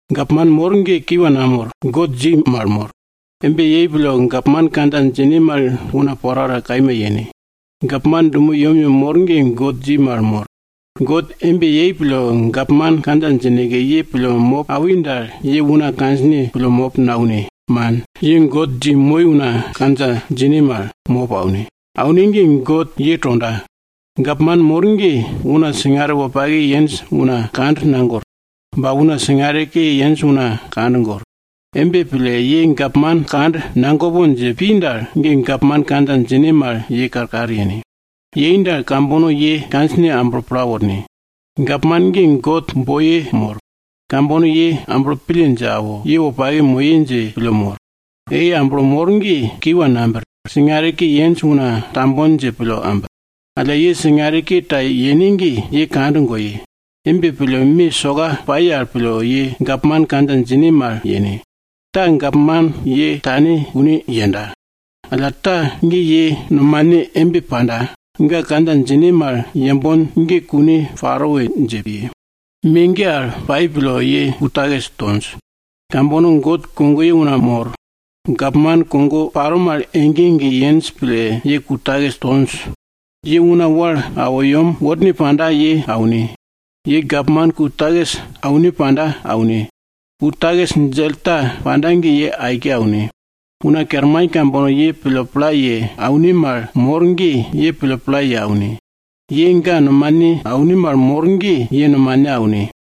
Gapman mor ge kiwa namor, God dji mal mor. Embe paro pille gapman kandja djine mal una porapora kaima yene. Gapman dumo yemyem mor ge God dji mal mor. God embe yei pille, gapman kandja djineke ye pille mop awi dal, ye una kandjine pille mop naune, man, ye God dji moi una kandja djine mal, mop aune. Aune ge, God ye tonda. Gapman mor ge, una singare wopake yenj una kand nagor. Ba una singare ke yenj una kand gor. Embe pille ye gapman kand nagopon dje pi dal, ge gapman kandja djine mal ye karkar yene. Ye embe yei dal, kambono ye kandjine amblo pla worne. Gapman ge God boiye mor. Kambono ye amblo pille dje awo, ye wopake moye dje pille mor. Ei amblo mor ge, kiwa nabir. Singare ke yenj una tambon dje pille ambir. Alla ye singare ke ta yene ge, ye kand goye! Embe pille ye gapman kandja djine mal yene. Yene ge me soka paro, ta, gapman ye tonda kune yenda. Alla ta, ge ye nomane embe panda, ga kandja djine mal yembon ge kune paro we dje piye. Me ge paro pille, ye ku takis tonj. Kambono God kogoye una mor, gapman kogo paro mal ege ege yenj pille ye ku takis tonj. Ye una wal awo yem worne panda, ye aune. Ye gapman ku takis aune panda, aune! Ku takis djell ta panda ge ye aike aune! Una kerman kambono ye pille pla ye aune mal mor ge, ye pille pla ye aune. Ye ga nomane aune mal mor ge, ye nomane aune!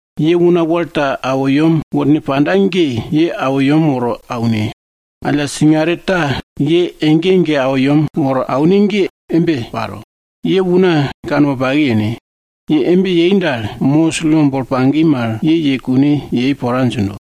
Ye una wal ta awo yem worne panda ge, ye awo yem woro aune! Alla singare ta ye ege ege awo yem woro aune ge embe paro, ye una kanwopake yene! Ye embe yei dal, Mosis lo bolo pagi mal, ye, ye kune yei pora djindo.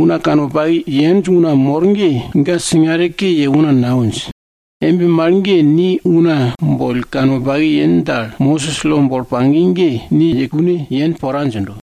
Una kanwopake yenj una mor ge, ga singare ke ye una nawinj. Embe mal ge, ni una boll kanwopake yen dal, Mosis lo bolo pagi ge ni ye kune yen pora djindo.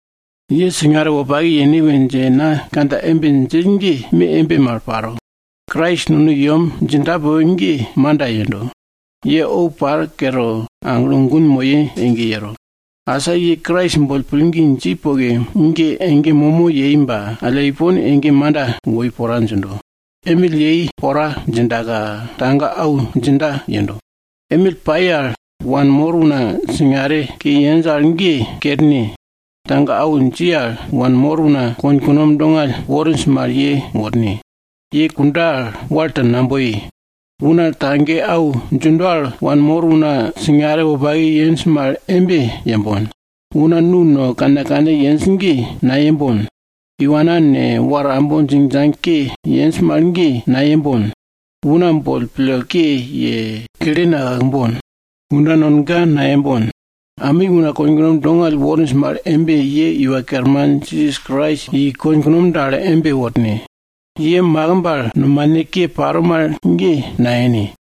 Ye singare wopake yene we dje na kandja embe djill ge, me embe mal paro. Krais nono i yem djinda poke ge manda yendo. Ye ou par ge kere, aglo gun moye ege yero. Asa ye Krais boll pillgi dji poke ge, ege momo yei ba alla ipon ege manda woi pora djindo. Emill pai pora dji, tage au djinda yendo. Emill pai al wanmor una singare ke yenj al ge kerne! Tage au dji al wanmor una konkunom dongall worinj mal, ye worne! Ye kunda al, wal ta naboye. Una tage au djindo al wanmor una singare wopake yenj mal embe yembon. Una nu no dall yenj mal ge nayembon! Iwana ne, war ambo djingdjang ke yenj mal ge, nayembon! Una boll pille ke ye, kle nakakbon, kunda nonga nayembon! Ami una konkunom dongall worinj mal embe, ye Iwa Kerman Jisas Krais i, konkunom dal embe worne. Ye makimb al nomane ke paro mal ge nayene.